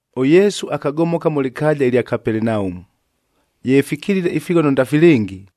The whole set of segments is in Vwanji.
ɄYesu akagomoka mʉ lɨkaaja lya Kapelenaumu. Ye fikilile ifighono ndafilɨngi,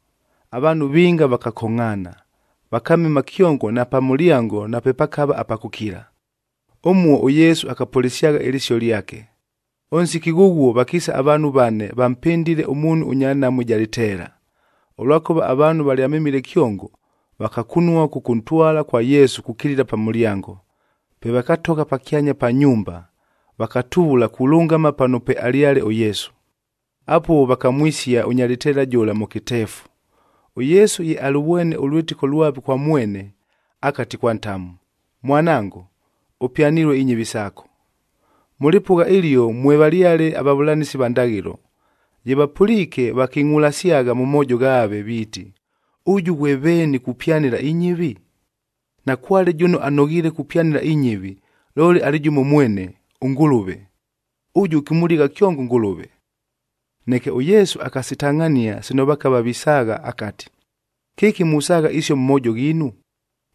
Avaanhu vinga vakakongʼhaana, vakamema kyongo na pa mʉlyango napepakava apa kʉkila. Ʉmuo ʉYesu akapʉlɨsyagha ɨlɨsio lyake. Ʉnsiki ghʉghuo vakiisa avaanhu vane vampɨndile ʉmuunhu ʉnya nhamu ɨja lɨteela. Ʉlwakʉva avaanhu valyamemile kyongo, vakakunua kʉkʉntwala kwa Yesu kukilila pa mʉlyango. Pe vakatogha pakyanya pa nyumba, vakatuvula kulʉngama pano pwealyale ʉYesu. Apuo vakamwisia ʉnya lɨteela jʉla mʉ kɨteefu. ɄYesu ye alʉvwene ʉlwɨtɨko lwave kwa mwene, akati kwa ntamu, “Mwanango, ʉpyanilue inyɨvi saako.” Mʉ lɨpʉgha ɨlio mwevalyale avavʉlanɨsi va ndaghɨlo, ye vapʉliike, viiti, “Ʉjʉ ghwe veeni kupyanɨla inyɨvi? Nakwale jʉno anoghiile kupyanɨla inyɨvi, looli alɨ jʉmo mwene, ʉNgʉlʉve. Ʉjʉ, ɨkʉmʉligha kyongo ʉNgʉlʉve.” Neke ʉYesu akasitangʼhania sino vakava visaagha akati, “Kɨki musaagha isio mʉ moojo ghiinu?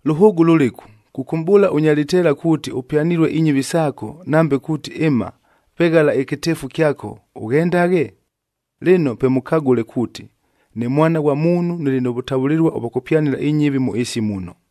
Lʉhʉʉgʉ lʉlɨku, kʉkʉmʼbʉʉla ʉnya lɨteela kuuti, ‘Ʉpyanilue inyɨvi saako,’ nambe kuuti, ‘Ɨma, veghala ɨkɨteefu kyako, ʉghendaghe’? Lɨno pe mʉkagʉle kuuti, ne Mwana ghwa Muunhub nɨlɨ nʉ vʉtavʉlɨlua ʉvwa kʉpyanɨla inyɨvi mʉ ɨɨsi muno...”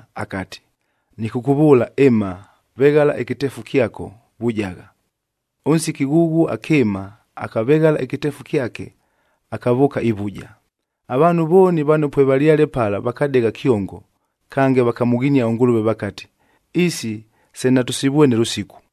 akati, “Nɨkʉkʉvʉʉla, ɨma, veghala ɨkɨteefu kyako vujagha.” Ʉnsiki ghʉghuo akɨɨma, akaveghala ɨkɨteefu kyake akavʉʉka ivuja. Avaanhu vooni vano pwevalyale pala vakadegha kyongo, kange vakamʉghinia ʉNgʉlʉve vakati, “Isi se natʉsivwene lʉsiku.”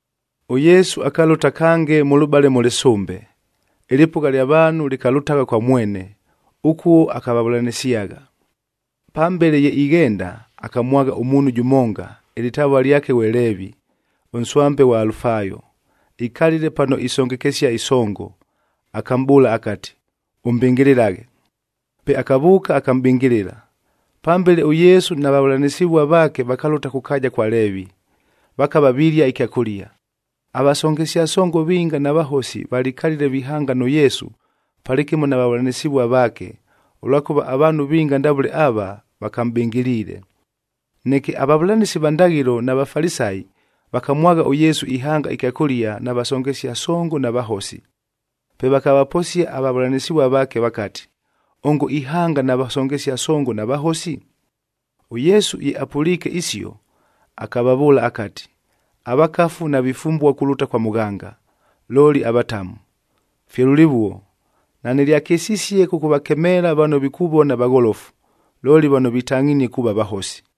ɄYesu akalʉta kange mʉlʉbale mʉ lɨsʉmbe, ɨlɨpʉgha lya vaanhu lɨkalʉtagha kwa mwene, ʉkuo akavavʉlanɨsyagha. Pambele ye ighenda, akamwagha ʉmuunhu jʉmonga, ɨlɨtavua lyake ghwe Leevi, ʉnswambe ghwa Alufaayo, ikalile pano isongekesia ɨsongo. Akamʼbʉʉla akati, “Ʉmbɨngɨlɨlaghe.” Pe akavʉʉka, akamʼbɨngɨlɨla. Pambele ʉYesu na vavʉlanɨsɨvua vaake vakalʉta kʉ kaaja kwa Leevi, vakava vilia ɨkyakʉlia. Avasongesia songoc vinga na vahosi valikalile vihanga nʉ Yesu palɨkɨmo na vavʉlanɨsɨvua vaake, ʉlwakʉva avaanhu vinga ndavʉle ava, vakamʼbɨngɨliile. Neke avavʉlanɨsi va ndaghɨlo na Vafalisayi,d vakamwagha ʉYesu ihanga ɨkyakʉlia na vasongesia songo na vahosi. Pe vakavaposia avavʉlanɨsɨvua vaake vakati, “Ongo ihanga na vasongesia songo na vahosi?” ɄYesu ye apʉliike isio, akavavʉʉla akati, “Avakafu navifumbua kulʉta kwa mʉghanga, looli avatamu. Fye lʉlɨvuo, nanɨlyakɨsisie kʉkʉvakemeela vano vikuvona vagholofu, looli vano vitangʼhinie kuuva vahosi.”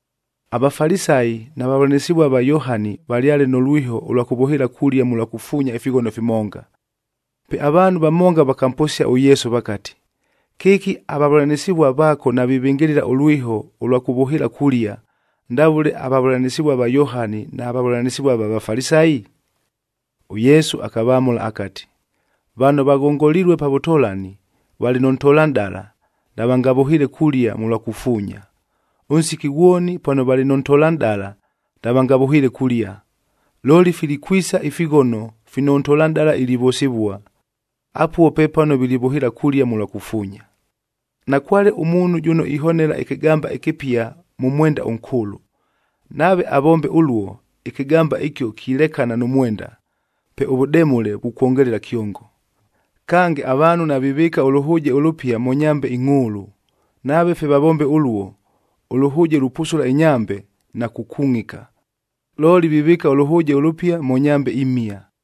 AVafalisayi na vavʉlanɨsɨvua va Yohani valyale nʉ lwiho ʉlwa kʉvʉhɨɨla kulia mʉlwa kufuunyae ifighono fimonga. Pe avaanhu vamonga vakamposia ʉYesu vakati, “Kɨki avavʉlanɨsɨvuaf vaako navivɨngɨlɨla ʉlwiho ʉlwa kʉvʉhɨɨla kulia, ndavʉle avavʉlanɨsɨvua va Yohani na vavʉlanɨsɨvua va Vafalisayi?” ɄYesu akavamʉla akati, “Vano vaghongolilue pa vʉtolani, valɨ nʉ ntolanʼdala, navangavʉhɨɨle kulia mʉlwa kufuunya. Ʉnsiki ghwoni pano valɨ nʉ ntolanʼdala navangavʉhɨɨle kulia. Looli, filikwisa ifighono fino ʉntolanʼdala ilivʉsɨvua, apuo pepano vilivʉhɨɨla kulia mʉlwa kufuunya. “Nakwale ʉmuunhu jʉno ihonela ɨkɨgamba ɨkɨpia mʉ mwenda ʉnkʉʉlʉ, nave avombe ʉluo, ɨkɨgamba ɨkio kilekana nʉ mwenda, pe ʉvʉdemʉle vukwongelela kyongo. Kange, avaanhu navivɨɨka ʉlʉhʉʉjeg ʉlʉpia mʉ nyambeh ingʼhʉʉlʉ, nave fye vavombe ʉluo, ʉlʉhʉʉje lupusula inyambe, na kukungʼika. Looli vivɨɨka ʉlʉhʉʉje ʉlʉpia mʉ nyambe imhia.”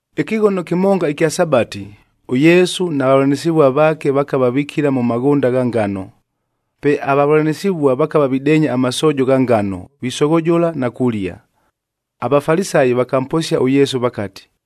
Ɨkɨghono kɨmonga ɨkya Sabati, ʉYesu na vavʉlanɨsɨvua vaake vakava vikila mʉ maghʉnda gha ngano. Pe avavʉlanɨsɨvua vakava videenya amasoojo gha ngano, visoghojola na kulia. AVafalisayi vakamposia ʉYesu vakati,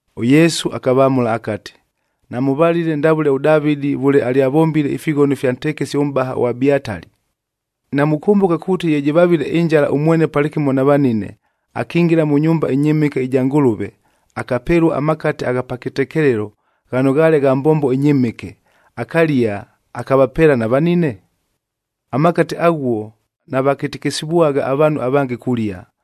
ɄYesu akavamʉla akati, “Namʉvalile ndavʉle ʉDavɨdi vʉle alyavombile ifighono ifya ntekesi ʉmʼbahaj ʉAbiatali? Namukʉmbʉka kuuti ye jɨvavile ɨnjala ʉmwene palɨkɨmo na vanine, akingila mʉ nyumba ɨnyɨmɨke ɨja Ngʉlʉve, akapelua amakate agha pa kɨtekelelo ghano ghaale gha mbombo ɨnyɨmɨke, akalia, akavapeela na vanine? Amakate aghuo navakɨtɨkɨsɨvwagha avaanhu avange kulia,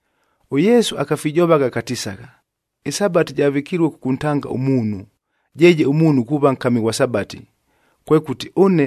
ɄYesu akafijovagha akatisagha, “ƗSabati javɨkilue kʉkʉntanga ʉmuunhu, jeeje ʉmuunhu kuuva nkami ghwa Sabati. Kwekʉti,